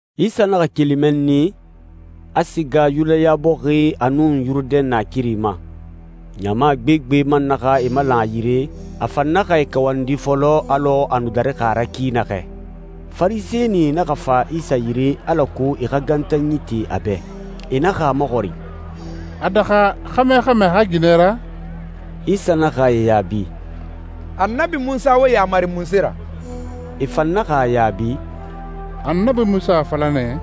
Isa naxa keli mɛnni, a siga Yudaya bɔxi a nun Yurudɛn naakiri ma. Ɲama gbegbe man naxa e malan a yire, a fan naxa e kawandi fɔlɔ, alɔ a nu darixi a ra ki naxɛ. Farisɛnie naxa fa Isa yire alako e xa gantanyi te a bɛ. E naxa a maxɔrin, «A daxa xɛmɛ xa mɛɛ a xa ginɛ ra?» Isa naxa e yaabi, «Annabi Munsa wo yamari munse ra?» E fan naxa a yaabi, «Annabi Munsa a fala nɛ,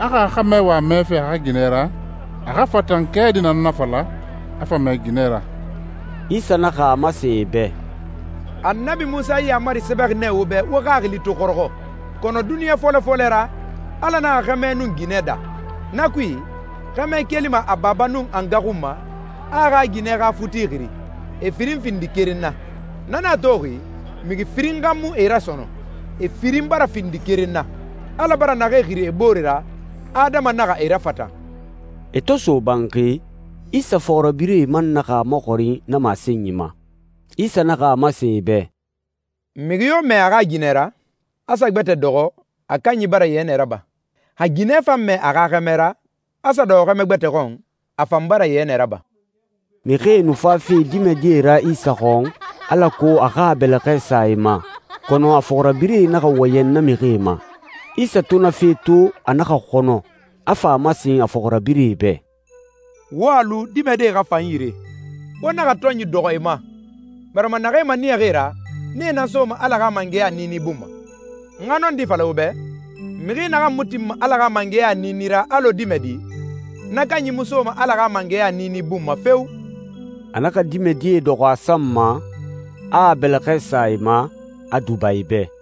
a xa xɛmɛ wa mɛɛfe a xa ginɛ ra, a xa fatan kɛɛdi nan nafala, a fa mɛɛ ginɛ ra.» Isa naxa a masen e bɛ, «Annabi Munsa yi yaamari sɛbɛxi nɛ wo bɛ wo xaxili to xɔrɔxɔ. Kɔnɔ duniɲa fɔlɔ fɔlɛ ra, Ala naxa xɛmɛ nun ginɛ daa. ‹Na kui, xɛmɛ kelima a baba nun a nga xun ma, a a xa ginɛ xa futi xiri, e firin findi keren na.› Na nan a toxi, mixi firin xa mu e ra sɔnɔn, e firin bara findi keren na. Ala bara naxee xiri e boore ra, adama naxa e rafatan.» E to so banxi, Isa fɔxirabirɛe man naxa a maxɔrin na masenyi ma. Isa naxa a masen e bɛ, «Mixi yo mɛɛ a xa ginɛ ra, a sa gbɛtɛ dɔxɔ, a kanyi bara yɛnɛ raba. Xa ginɛ fan mɛɛ a xa xɛmɛ ra, a sa dɔxɔ xɛmɛ gbɛtɛ xɔn, a fan bara yɛnɛ raba.» Mixie nu fafe dimɛdie ra Isa xɔn, alako a xa a bɛlɛxɛ sa e ma, kɔnɔ a fɔxirabirɛe naxa wɔyɛn na mixie ma. Isa to na fe to, a naxa xɔnɔ, a fa a masen a fɔxirabirɛe bɛ, «Wo a lu dimɛdie xa fa n yire. Wo naxa tɔnyi dɔxɔ e ma, barima naxee maniyaxi e ra, nee nan soma Ala xa mangɛya niini bun ma. N xa nɔndi fala wo bɛ, mixi naxan mu tinma Ala xa mangɛya niini ra alɔ dimɛdi, na kanyi mu soma Ala xa mangɛya niini bun ma feo!» A naxa dimɛdie dɔxɔ a san ma, a a bɛlɛxɛ sa e ma, a duba e bɛ.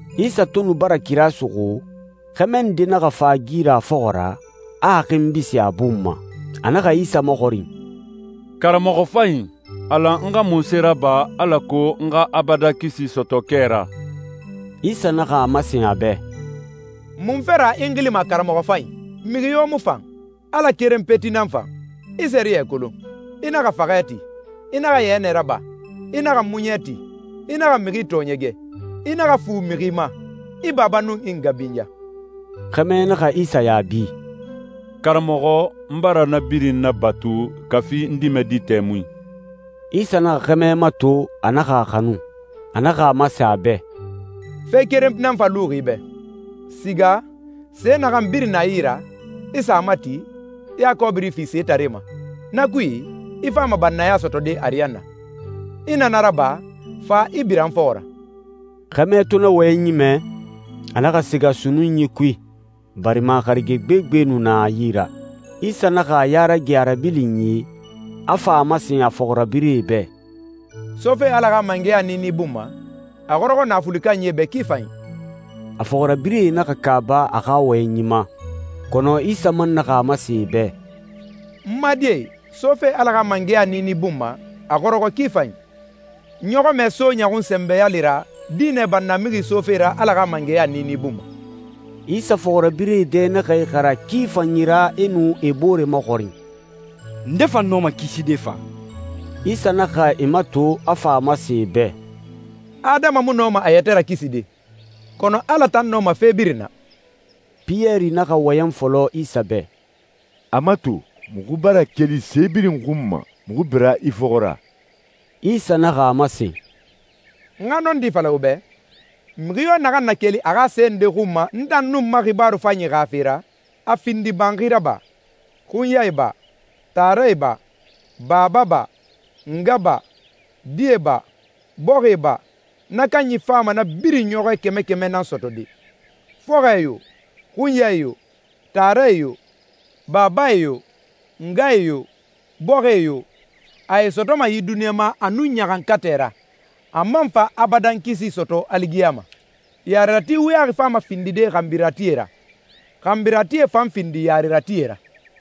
Isa to nu bara kira suxu, xɛmɛ nde naxa fa a gi ra a fɔxɔ ra, a a xinbi sin a bun ma. A naxa Isa maxɔrin, «Karamɔxɔ fanyi, a lan n xa munse raba alako n xa abadan kisi sɔtɔ kɛ ra?» Isa naxa a masen a bɛ, «Munfe ra i n xilima karamɔxɔ fanyi? Mixi yo mu fan. Ala keren peti nan fan. I sɛriyɛ kolon: ‹I naxa faxɛ ti. I naxa yɛnɛ raba. I naxa muɲɛ ti. I naxa mixi tɔɔɲɛgɛ. I naxa fu mixi ma. I baba nun i nga binya.›» Xɛmɛ naxa Isa yaabi, «Karamɔxɔ, n bara na birin nabatu kafi n dimɛdi tɛmui.» Isa naxa xɛmɛ mato, a naxa a xanu. A naxa a masen a bɛ, «Fe keren nan fa luxi i bɛ. Siga, se naxan birin na i yi ra, i sa a mati, i a kɔbiri fi setaree ma. Na kui, i fama bannaya sɔtɔde ariyanna. I na na raba, fa, i bira n fɔxɔ ra.» Xɛmɛ to na wɔyɛnyi mɛ, a naxa siga sunnunyi kui, barima harige gbegbe nu na a yi ra. Isa naxa a ya rage a rabilinyi, a fa a masen a fɔxirabirɛe bɛ, «Sofe Ala xa mangɛya niini bun ma, a xɔrɔxɔ naafuli kanyie bɛ ki fanyi!» A fɔxirabirɛe naxa kaaba a xa wɔyɛnyi ma, kɔnɔ Isa man naxa a masen e bɛ, «N ma die, sofe Ala xa mangɛya niini bun ma, a xɔrɔxɔ ki fanyi! Ɲɔxɔmɛ so ɲɔxun sɛnbɛ yale ra, dinɛ bannamixi sofe ra Ala xa mangɛya niini bun ma.» Isa fɔxirabirɛe dɛ naxa ixara ki fanyi ra, e nu e bore maxɔrin, «Nde fa nɔma kiside fa?» Isa naxa e mato, a fa a masen e bɛ, «Adama mu nɔma a yɛtɛ rakiside, kɔnɔ Ala tan nɔma fe birin na.» Piyɛri naxa wɔyɛn fɔlɔ Isa bɛ, «A mato, muxu bara keli se birin xun ma, muxu bira i fɔxɔ ra.» Isa naxa a masen, «N xa nɔndi fala wo bɛ, mixi yo naxan na keli a xa se nde xun ma n tan nun n ma xibaaru fanyi xa fe ra, a findi banxi ra ba, xunyae ba, taarae ba, baba ba, nga ba, die ba, bɔxie ba, na kanyi fama na birin ɲɔxɔɛ kɛmɛ kɛmɛ nan sɔtɔde. Fɔxɔɛe yo, xunyae yo, taarae yo, babae yo, ngae yo, bɔxie yo, a e sɔtɔma yi duniɲa ma a nun ɲaxankatɛ ra, a man fa abadan kisi sɔtɔ aligiyama. Yarerati wuyaxi fama findide xanbiratie ra, xanbiratie fan findi yareratie ra.»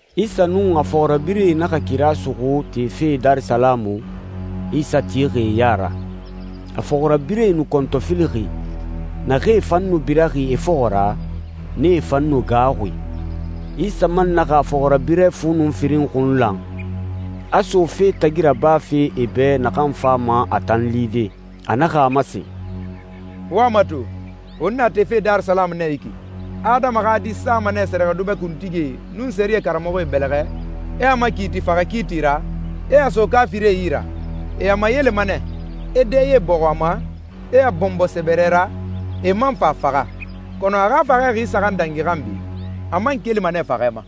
Isa nun a fɔxirabirɛe naxa kira suxu tefe Darisalamu, Isa tixi e ya ra. A fɔxirabirɛe nu kɔntɔfilixi, naxee fan nu biraxi e fɔxɔ ra, nee fan nu gaaxuxi. Isa man naxa a fɔxirabirɛ fu nun firin xun lan, a so fe tagi rabafe e bɛ naxan fama a tan lide. A naxa a masen, «Wo a mato, won na tefe Darisalamu nɛ yi ki. Adama xa Di sama nɛ sɛrɛxɛdubɛ kuntigie, nun sɛriyɛ karamɔxɔe bɛlɛxɛ, e a makiiti faxɛ kiiti ra, e a so kaafirie yi ra. E a mayelema nɛ, e dɛye bɔxun a ma, e a bɔnbɔ sɛbɛrɛ ra, e man fa a faxa. Kɔnɔ a xa faxɛ xi saxan dangi xanbi, a man kelima nɛ faxɛ ma.»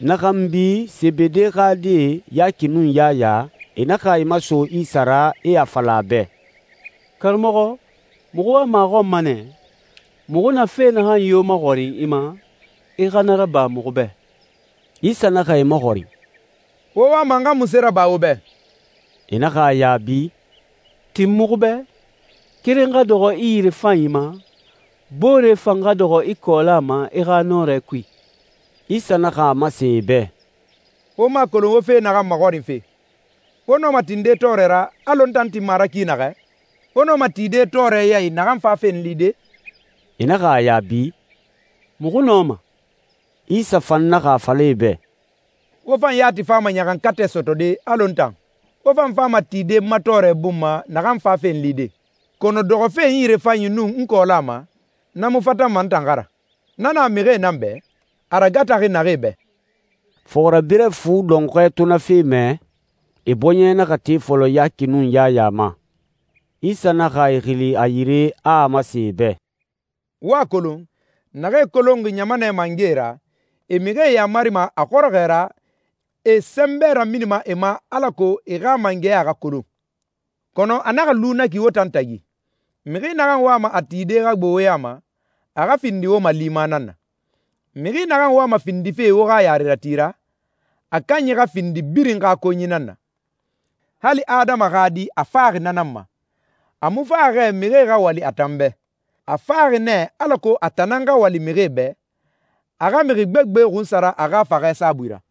Na xanbi, Sebede xa die, Yaki nun Yaya, e naxa e maso Isa ra, e a fala a bɛ, «Karamɔxɔ, muxu wama a xɔn ma nɛ, muxu na fe naxan yo maxɔrin i ma, i xa na raba muxu bɛ.» Isa naxa e maxɔrin, «Wo wama n xa munse raba wo bɛ?» E naxa a yaabi, «Tin muxu bɛ, keren xa dɔxɔ i yirefanyi ma, boore fan xa dɔxɔ i kɔɔla ma i xa nɔrɛ kui.» Isa naxa a masen e bɛ, «Wo mu a kolon wo fe naxan maxɔrinfe. Wo nɔma tinde tɔɔrɛ ra, alɔ n tan tinma a ra ki naxɛ? Wo nɔma tide tɔɔrɛ ya i naxan fafe n lide?» E naxa a yaabi, «Muxu nɔma.» Isa fan naxa a fala e bɛ, «Wo fan yati fama ɲaxankatɛ sɔtɔde alɔ n tan. Wo fan fama tide n ma tɔɔrɛ bun ma naxan fafe n lide. Kɔnɔ dɔxɔfe n yirefanyi nun n kɔɔla ma, na mu fatanma n tan xa ra. Na na mixie nan bɛ, a ragataxi naxee bɛ.» Fɔxirabirɛ fu dɔnxɔɛ to na fe mɛ, e bɔɲɛ naxa te fɔlɔ Yaki nun Yaya ma. Isa naxa e xili a yire, a a masen e bɛ, «Wo a kolon, naxee kolonxi ɲamanɛ mangɛe ra, e mixie yamarima a xɔrɔxɔɛ ra, e e sɛnbɛ raminima e ma alako e xa mangɛya xa kolon. Kɔnɔ a naxa lu na ki wo tan tagi. Mixi naxan wama a tide xa gbo wo ya ma, a xa findi wo malima nan na. Mixi naxan wama findife wo xa yarerati ra, a kanyi xa findi birin xa konyi nan na. Hali Adama xa Di a faxi na nan ma. A mu faxi xɛ mixie xa wali a tan bɛ. A faxi nɛ alako a tan nan xa wali mixie bɛ, a xa mixi gbegbe xunsara a xa faxɛ saabui ra.»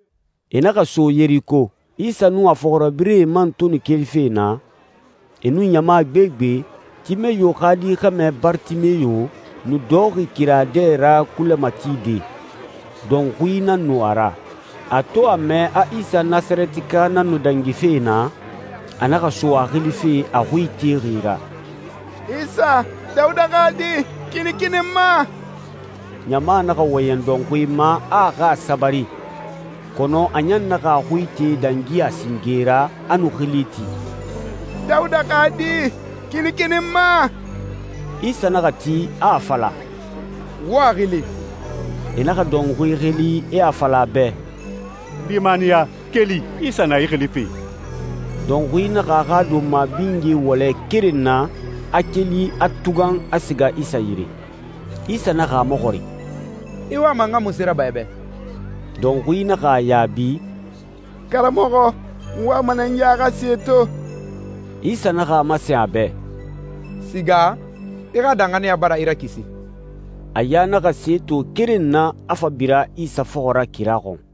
E naxa so Yeriko. Isa nun a fɔxirabirɛe man to nu kelife naa, e nun ɲama gbegbe, Timeyo xa di xɛmɛ Baritimeyo nu dɔxɔxi kira dɛ ra kulɛ matide. Dɔnxui nan nu a ra. A to a mɛ a Isa Nasarɛtika nan nu dangife naa, a naxa so a xilife a xui itexi ra, «Isa, Dawuda xa Di, kinikini n ma.» Ɲama naxa wɔyɛn dɔnxui ma a a xa a sabari, kɔnɔ a ɲan naxa a xui ite dangi a singe ra, a nu xili ti, «Dawuda xa Di, kinikini n ma.» Isa naxa ti, a a fala, «Wo a xili.» E naxa dɔnxui xili, e a fala a bɛ, «Limaniya! Keli, Isa na i xilife!» Dɔnxui naxa a xa donma binye wɔlɛ keren na, a keli, a tugan, a siga Isa yire. Isa naxa a maxɔrin, «I wama n xa munse raba i bɛ?» Dɔnxui naxa a yaabi, «Karamɔxɔ, n wama nɛ n ya xa se to.» Isa naxa a masen a bɛ, «Siga, i xa danxaniya bara i rakisi.» A ya naxa se to keren na, a fa bira Isa fɔxɔ ra kira xɔn.